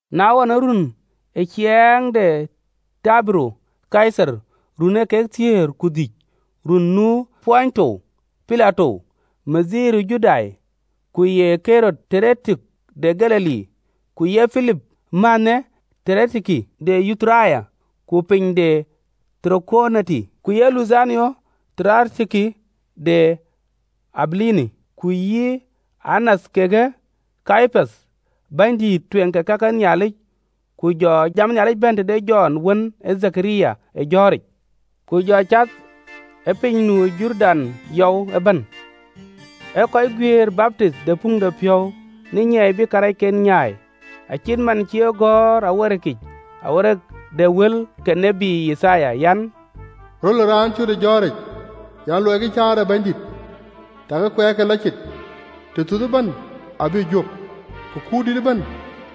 Na ɣɔn, ë ruöön ë ciɛɛŋ de Tibero Kaithar, ruöön ee kek thiëër ku dhïc, ruöön nu Pontio Pilato ke ye bɛ̈ny ë Juda, ku ye Ɣerod bɛ̈ny de Galili, ku ye Pilip mänhë bɛ̈ny de Yituria, ku piny de Tarakoniti, ku ye Luthanio bɛ̈ny de Abilini, Ku ye yï Anath kekë Kayapath bänydït tueŋ ke ka ke Nhialic, go jam ë Nhialic bɛ̈n tëde Jɔn wën ë Dhekaria ë jɔ̈ɔ̈ric. Ku jɔ cath ë piny nu ë Jordan yɔu ëbɛ̈n, ee kɔc guiëër baptinh ë puŋdepiɔ̈u në nyiɛɛi bï karɛc nyaai. (LXX). Acït man cï e gɔ̈ɔ̈r ë këcïgɔ̈ɔ̈r de tiët Yithaya yic an, “Röl ë raan cöt ë jɔ̈ɔ̈ric, ‘Luɔikï kueer ë Bɛ̈nydït, takï kuɛɛrke lɔ cit! Wak ëbɛ̈n abï juök, ku kuurdït ëbɛ̈n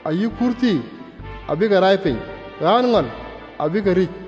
ayï kuurthii abï ke rai piny, ɣään ŋɔl abï ke rïc,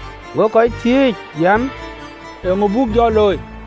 Go kuut dïït ë kɔc thiëëc an, “Eeŋö buk jɔ looi?”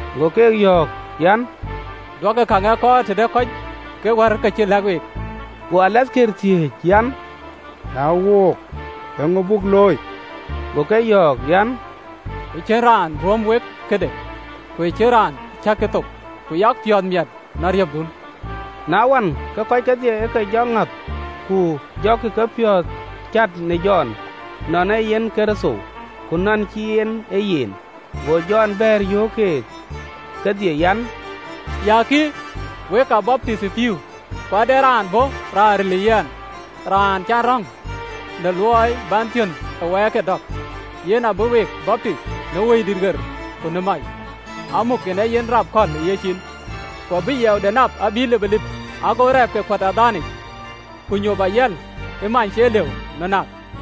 Go keek yöök an, “Duökï käŋ ë kɔɔr tëde kɔc kë wär kë cï lɛ̈k week.” Go alathkëër thiëëc an, “Na wook, eeŋö buk looi?” Go ke yɔ̈ɔ̈k an, “Ë cïn raan ruöm wek këde, ku ë cïn raan cäkï thok, ku yak piɔ̈ɔ̈th miɛt në ariöpdun.” Na ɣɔn, ke kɔc kedhie ë ke jɔ ŋɔ̈th, ku jɔkï kepiɔ̈ɔ̈th cät në Jɔn, nɔn ee yen Kërtho, ku nɔn cïï en ee yen. Go Jɔn bɛ̈ɛ̈r, yöök keek kedhie an, “Ya kï, wek aa baptith ë pïïu, ku ade raan bɔ̈ raan ril ë yɛn, raan cä yɛn röŋ në luɔi bän thiönh ë wɛɛrke dɔ̈k, yen abï week baptith në Wëidït ɣer ku në mac. Amuk kën ee yen rap kɔ̈l ë yen, ku abï yiɛɛude nap abï lipëlip, ago agamɔde kuöt ë adhaande yic, ku nyop ayiɛl ë many cie lëu në näk.”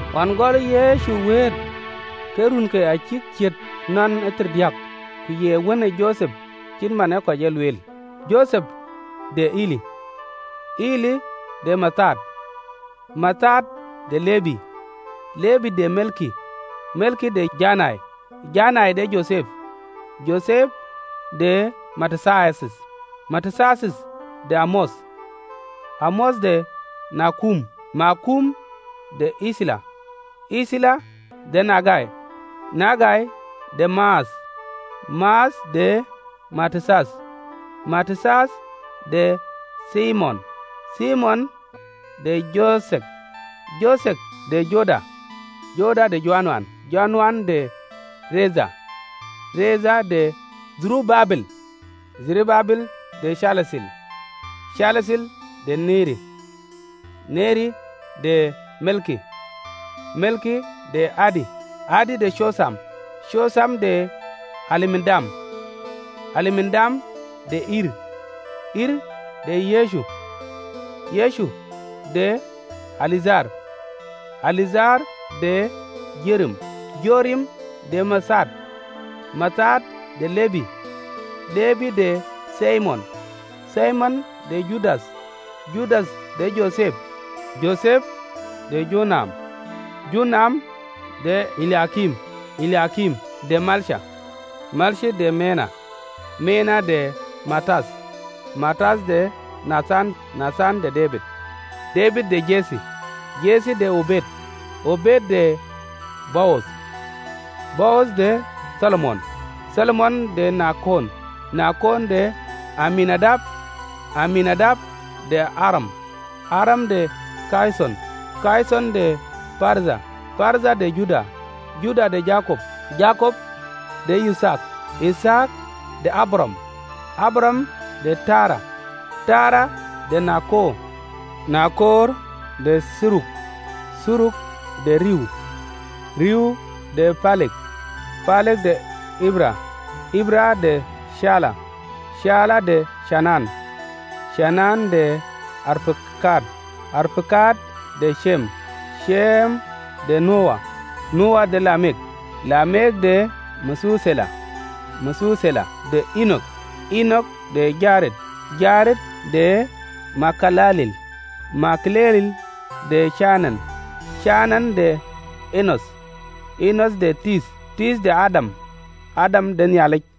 Ɣɔn gɔlë Yecu wëët, ke runke acïk ciët thiërdiäk, ku ye wën ë Jothep (cït man ee kɔc e lueel), Jothep de Eli Eli de Mathat, Mathat de Lebi, Lebi de Melki, Melki de Janai në Jothep, Jothep de Matathiath, Matathiath de Amoth, Amoth de Naɣum, Naɣum de Ethli, Ethli de Nagai, Nagai de Maath, Maath de Matathiath, Matathiath de Themein, Themein de Jothek, Jothek de Joda, Joda de Joana, Joana de Retha, Retha de Dherubabel, Dherubabel de Caltiɛl, Caltiɛl de Neri Neri de Melki, Melki de Adi, Adi de Cotham, Cotham de Elmadam, Elmadam de Er, Er de Yecu, Yecu de Eliedher, Eliedher de Jorim, Jorim de Mathat, Mathat de Lebi, Lebi de Thimion, Thimion de Judath, Judath de Jothep, Jothep de Jonam, Jonam, de Eliakim, Eliakim de Melea, Melea de Mena, Mena de Matath, Matath de Nathan, Nathan de Debid, Debid de Jethe, Jethe de Obed, Obed de Bowadh, Bowadh de Thalmon, Thalmon de Nacon, Nacon de Aminadab, Aminadab de Aram, Aram de Ɣedheron, Ɣedheron de Peredh, Peredh de Juda, Juda de Jakop, Jakop de Yithaak, Yithaak de Abraɣam, Abraɣam de Tera, Tera de Naɣor, Naɣor de Thiruk, Thiruk de Riu, Riu de Pelek, Pelek de Eber, Eber de Cela, Cela de Cainan, Cainan de Arpakad, Arpakad de Cem, Cem de Nowa, Nowa de Lamek, Lamek de Mathuthela, Mathuthela de Eenok, Eenok de Jared, Jared de Maɣalaleel, Maɣalaleel de Kenan, Kenan de Enoth, Enoth de Theth, Theth de Adam, Adam de Nhialic.